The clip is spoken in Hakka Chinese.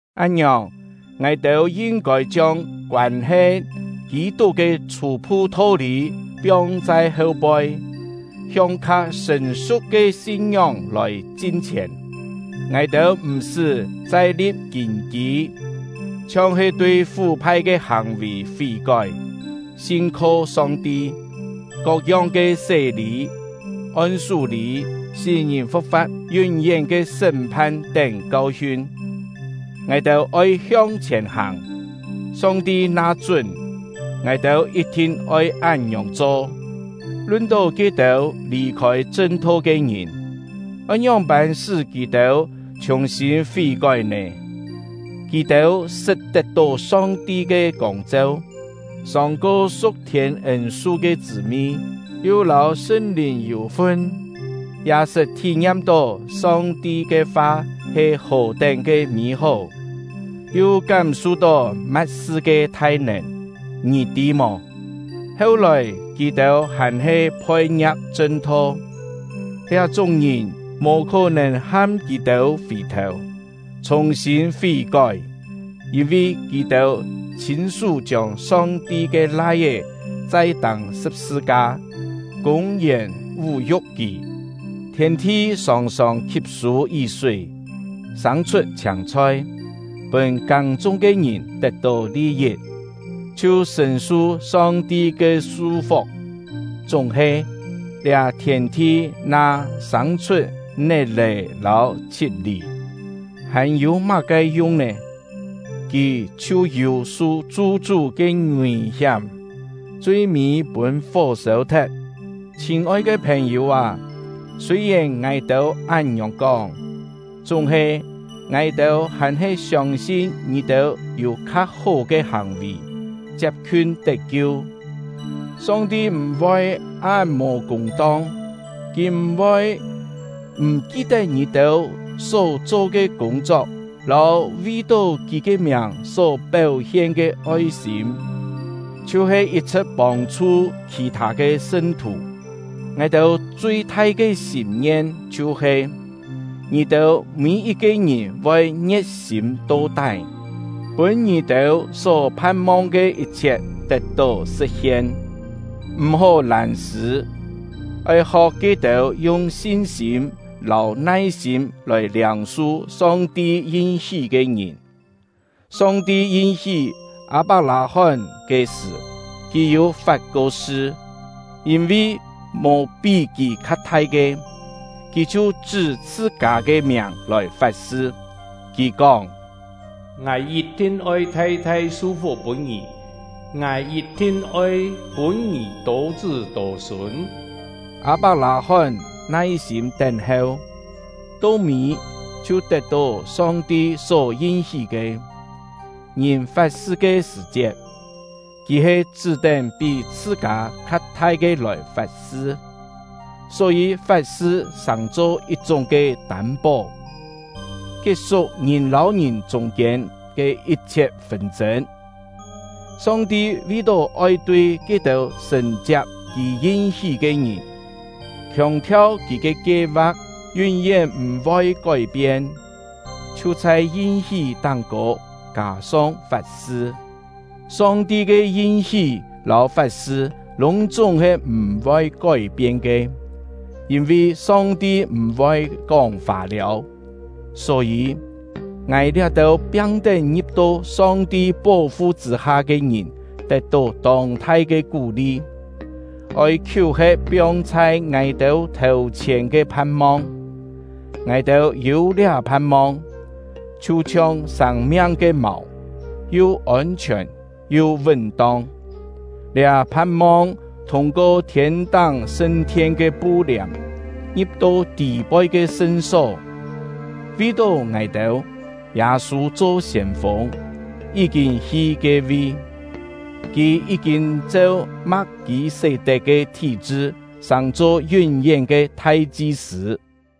Án-ngiòng, ngài-têu yin-kôi chiông koân-he Kî-tuk ke chhû-phu tho-lî piong chhai heu-poi, hiong kha sṳ̀n-su̍k ke sin-ngióng lòi chin-chhièn. Ngài-têu m̀-sṳ́ chai li̍p kîn-kî, chhiong-he tui fú-phai ke hàng-vì fí-kói, sin-kho Song-ti, kok-yong ke sé-lî, on-sú-lî, sí-ngìn fu̍k-fa̍t, yún-yén ke sṳ́m-phan tén kau-hiun. Ngài-têu oi hiong-chhièn hàng! Song-ti na chún, ngài-têu yit-thin oi án-ngiòng cho. Lun-tó ke-têu lì-khôi chṳn-tho ke ngìn, oi ngióng-pân sṳ́ kì-têu chhùng-sîn fí-kói nè? Kì-têu sṳt tet-tó Song-ti ke kông-cheu, sòng-ko su̍k-thiên ên-su ke chṳ̂-mi, yu lâu Sṳn-Lìn yû-fun, ya sṳt thí-ngiam-tó Song-ti ke fa he hò-tén ke mî-hó, yu kám-su-tó ma̍t-sṳ ke thai-nèn. Ngì tî mò, heu-lòi kì-têu hàn-he phoi-ngia̍k chṳn-tho! Liá-chúng ke ngìn mò khó-nèn ham kì-têu fì-thèu, chhùng-sîn fí-kói; yîn-vi kì-têu chhîn-sú chiông Song-ti ke Lai-é chai tâng sṳ̍p-sṳ-ka, kûng-yèn vú-yu̍k kì. Thièn-thi sòng-sòng khi̍p-sû yí-súi, sâng-chhut chhiâng-chhoi, pûn kâng-chung ke ngìn tet-tó li-yit, chhiu sṳ̀n-su Song-ti ke su-fuk. Chúng-he, liá thièn-thi na sâng-chhut net-è lâu chhi̍t-lì, hàn-yû má-ke yung nè? Kì chhiu yû su chu-chú ke ngùi-hiám, chui-mî pûn fó sêu-thet. Chhîn-oi ke phèn-yû â, sûi-yèn ngài-têu án-ngiòng kóng, chúng-he ngài-têu hàn-he siông-sin ngì-têu yû kha-hó ke hàng-vì, chiap-khiun tet-kiu. Song-ti m̀-voi án mò kûng-tong; Kì m̀-voi m̀ ki-tet ngì-têu só-cho ke kûng-chok lâu vi-tó Kì ke miàng só péu-hien ke oi-sîm, chhiu-he yit-chhṳ̍t pông-chhu khì-thâ ke sṳn-thù. Ngài-têu chui-thai ke sîm-ngien chhiu-he: Ngì-têu mî-yit-ke ngìn voi ngie̍t-sîm to-tái, pûn ngì-têu só phan-mong ke yit-chhiet tet-tó sṳ̍t-hien. M̀-hó lân-sṳ̂, oi ho̍k ke-têu yung sin-sîm lâu nai-sîm lòi liâng-su Song-ti yin-hí ke ngìn. Song-ti yin-hí Â-pak-lâ-hón ke sṳ̀, Kì yû fat-ko sṳ. Yîn-vi mò pí Kì kha thai ke, Kì chhiu chṳ́ chhṳ-kâ ke miàng lòi fat-sṳ. Kì kóng: “Ngài yit-thin oi thai-thai su-fuk pûn ngì; Ngài yit-thin oi pûn ngì tô-chṳ́ tô-sûn.” Â-pak-lâ-hón nai-sîm tén-heu, to mî chhiu tet-tó Song-ti só yin-hí ke. Ngìn fat-sṳ ke sṳ̀-chiet, kì he chṳ́-tén pí chhṳ-kâ kha thai ke lòi fat-sṳ; só-yî fat-sṳ sàng-cho yit-chúng ke tâm-pó, kiet-suk ngìn lâu ngìn chûng-kiên ke yit-chhiet fûn-chên. Song-ti vi-tó oi tui ke-têu sṳ̀n-chiap Kì yin-hí ke ngìn, khiòng-thiau Kì ke kie-va̍k yún-yén m̀-voi kói-pien, chhiu chhai yin-hí táng-kô kâ-song fat-sṳ. Song-ti ke yin-hí lâu fat-sṳ lûng-chúng he m̀-voi kói-pien ke, yîn-vi Song-ti m̀-voi kóng fâ-liâu. Só-yî, ngài liá-têu piang-tén ngi̍p-to Song-ti pó-fu chṳ̂-ha ke ngìn tet-tó tông-thai ke kú-li, oi khiú-he̍t piong chhai ngài-têu thèu-chhièn ke phan-mong. Ngài-têu yû liá phan-mong, chhiu-chhiong sâng-miang ke màu, yu ôn-chhiòn yu vún-tong. Liá phan-mong thûng-ko thiên-táng sṳn-thien ke pu-liàm, ngi̍p-to tî-poi ke sṳn-só. Vi-tó ngài-têu, Yâ-sû cho siên-fûng, yí-kîn hi ke-vi; kì yí-kîn cheu Ma̍k-kî-sé-tet ke thí-chṳ sàng-cho yún-yén ke thai-chi-sṳ̂.